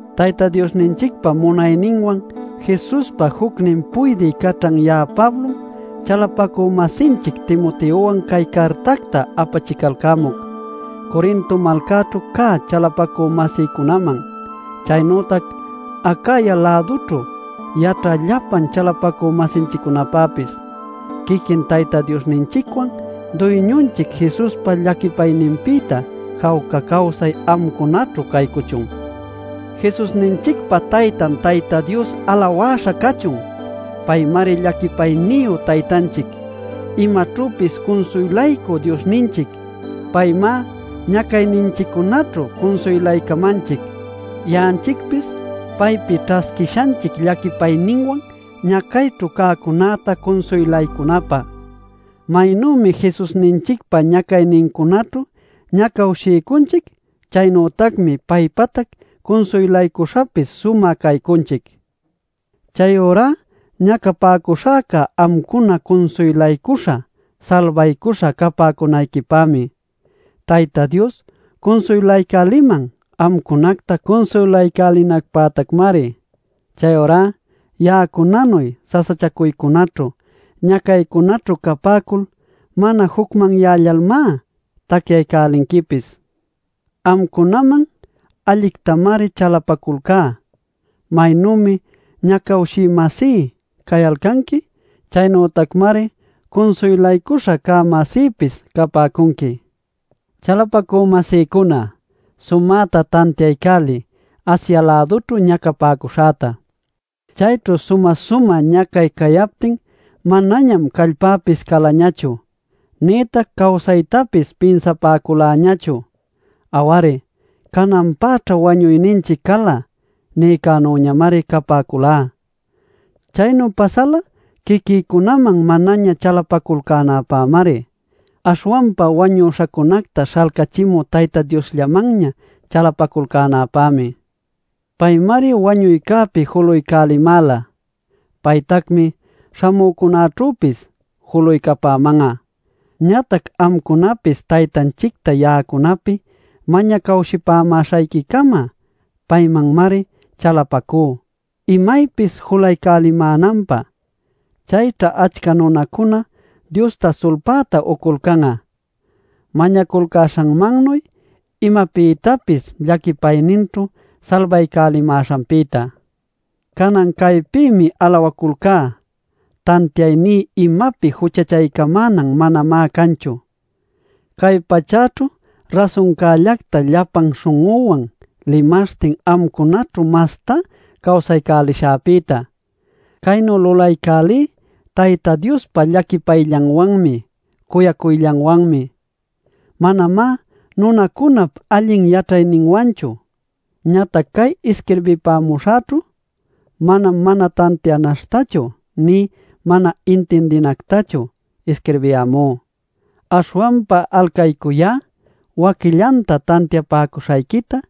Tayta Diosninchicpa munayninwan Jesuspa jucnin puydï caćhan ya'a Pablom, chalapacü-masinchic Timoteowan cay cartacta apachicalcämuc Corinto malcaćhu cä chalapacü-masïcunaman, chaynütac Acaya-lädućhu yaćhä llapallan chalapacü-masinchiccunapäpis. Quiquin Tayta Diosninchicwan Duyñunchic Jesuspa llaquipayninpïta jawca cawsay amcunaćhu caycuchun. ¡Jesusninchicpa Taytan Tayta Dios alawäśha cachun! Paymari llaquipayniyu Taytanchic, imaćhüpis cunsuylaycü Diosninchic. Paymá ñacayninchiccunaćhu cunsuylaycamanchic, ya'anchicpis paypi ćhasquishanchic llaquipayninwan ñacayćhu cäcunäta cunsuylaycunapä. Maynümi Jesusninchicpa ñacaynincunaćhu ñacawshiycunchic; chaynütacmi paypatac cunsuylaycuśhapis sumä caycunchic. Chayurá ñacapäcuśhäca amcuna cunsuylaycuśha salbaycuśha capäcunayquipämi. Tayta Dios cunsuylaycäliman amcunacta cunsuylaycälinacpätacmari. Chayurá ya'acunanuy sasachacuycunäćhu, ñacaycunäćhu capäcul mana jucmanyällalmá tacyaycälinquipis. Amcunaman allictamari chalapaculcá; maynümi ñacawshï-masí cayalcanqui, chaynütacmari cunsuylaycuśha cä-masïpis capäcunqui. Chalapacü-masïcuna, sumäta tantiaycäliy Asia-lädućhu ñacapäcuśhäta: Chayćhu sumä-sumä ñacay cayaptin manañam callpäpis calañachu, nïtac cawsaytapis pinsapäculäñachu. Aw-ari, “Cananpäćha wañuyninchic cala” nïcänüñamari capäculá. Chaynu pasäla quiquïcunaman manaña chalapacuyalcänäpämari, aśhwanpa wañüśhacunacta śhalcachimü Tayta Diosllamanña chalapaculcänäpämi. Paymari wañuycäpi julaycälimäla; paytacmi śhamücunaćhüpis julaycapäman'a. Ñatac amcunapis Taytanchicta ya'acunapi mañacawshipämäśhayquicama paymanmari chalapacú imaypis julaycamänanpä. Chayćha achca nunacuna Diosta sulpäta uculcan'a, mañaculcäśhanmannuy imapïtapis llaquipayninćhu salbaycälimäśhanpïta. Canan caypïmi alawaculcá: tantiayní imapi juchachaycamänan manamá canchu, cay pachäćhu rasuncällacta llapan śhun'üwan limaśhtin amcunaćhu mastá cawsaycälishäpïta. Caynu lulaycälí Tayta Diospa llaquipayllanwanmi cuyacuyllanwanmi, manamá nunacunap allin yaćhayninwanchu. Ñatac cay isquirbipämuśhäćhu manam mana tantianaśhtachu nï mana intindinactachu isquirbiyämú. Aśhwanpa alcaycuyá waquillanta tantiapäcuśhayquita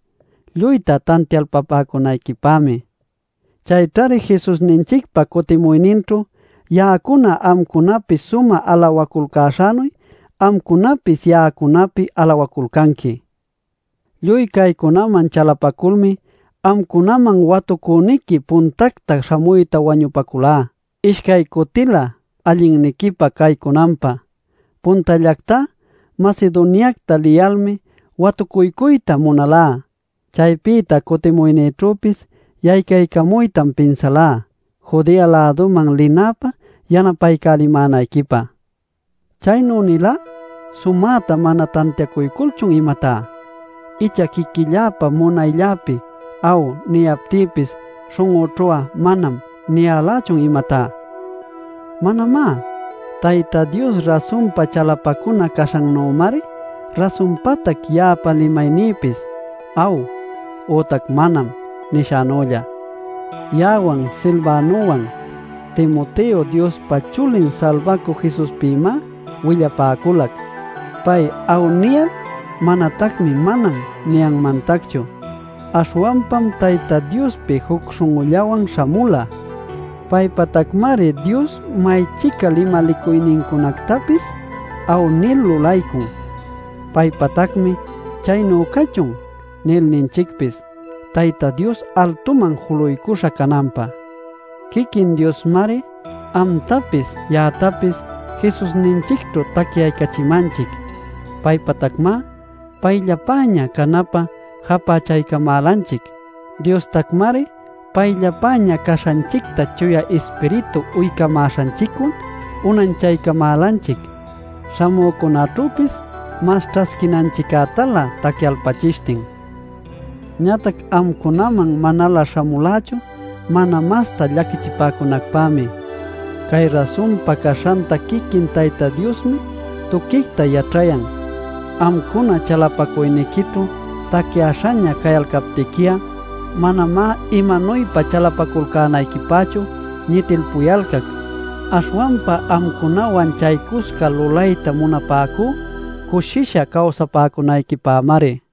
lluyta tantialpapäcunayquipämi. Chayćhari Jesusninchicpa cutimuyninćhu ya'acuna amcunapi sumä alawaculcäśhänuy amcunapis ya'acunapi alawaculcanqui. Lluy caycunaman chalapaculmi amcunaman watucüniqui puntacta śhamuyta wañupaculá ishcay cutilä allinniquipä caycunanpä. Puntallactá Macedoniacta liyalmi watucuycuyta munalá. Chaypïta cutimuynïćhüpis yaycaycamuytam pinsalá Judea-läduman linäpä yanapaycälimänayquipä. Chaynu nilá ¿sumäta mana tantiacuyculchun, imatá? ¿Icha quiquilläpa munaylläpi “aw” niyaptïpis śhun'üćhu'a “manam” nilächun, imatá? Manamá. Tayta Dios rasunpa chalapacuna caśhannümari rasunpatac ya'apa limaynïpis “aw” ütac “manam” nishänülla. Ya'awan Silvanowan Timoteo Diospa Chulin Salbacü Jesuspïmá willapäculac. Pay “aw” niyal manatacmi “manam” niyanmantacchu. Aśhwanpam Tayta Diospi juc śhun'ullawan śhamula. Paypatacmari Dios may-chica limalicuynincunactapis “aw” nil lulaycun. Paypatacmi “chaynu cachun” nil ninchicpis Tayta Dios altuman juluycuśha cananpä. Quiquin Diosmari amtapis ya'actapis Jesusninchicćhu tacyaycachimanchic. Paypatacmá payllapäña canapä japächaycamälanchic. Diostacmari payllapäña caśhanchicta Chuya Ispiritu uycamäśhanchicwan unanchaycamälanchic, śhamücunäćhüpis mas ćhasquinanchictalä tacyalpachishtin. Ñatac amcunaman manalä śhamulächu mana masta llaquichipäcunacpämi. Cay rasunpa caśhanta quiquin Tayta Diosmi tuquicta yaćhayan. Amcuna chalapacuyniquićhu tacyäśhaña cayalcaptiqui'a manamá imanuypa chalapaculcänayquipächu ñitilpuyalcac. Aśhwanpa amcunawan chaycusca lulayta munapäcú cushisha cawsapäcunayquipämari.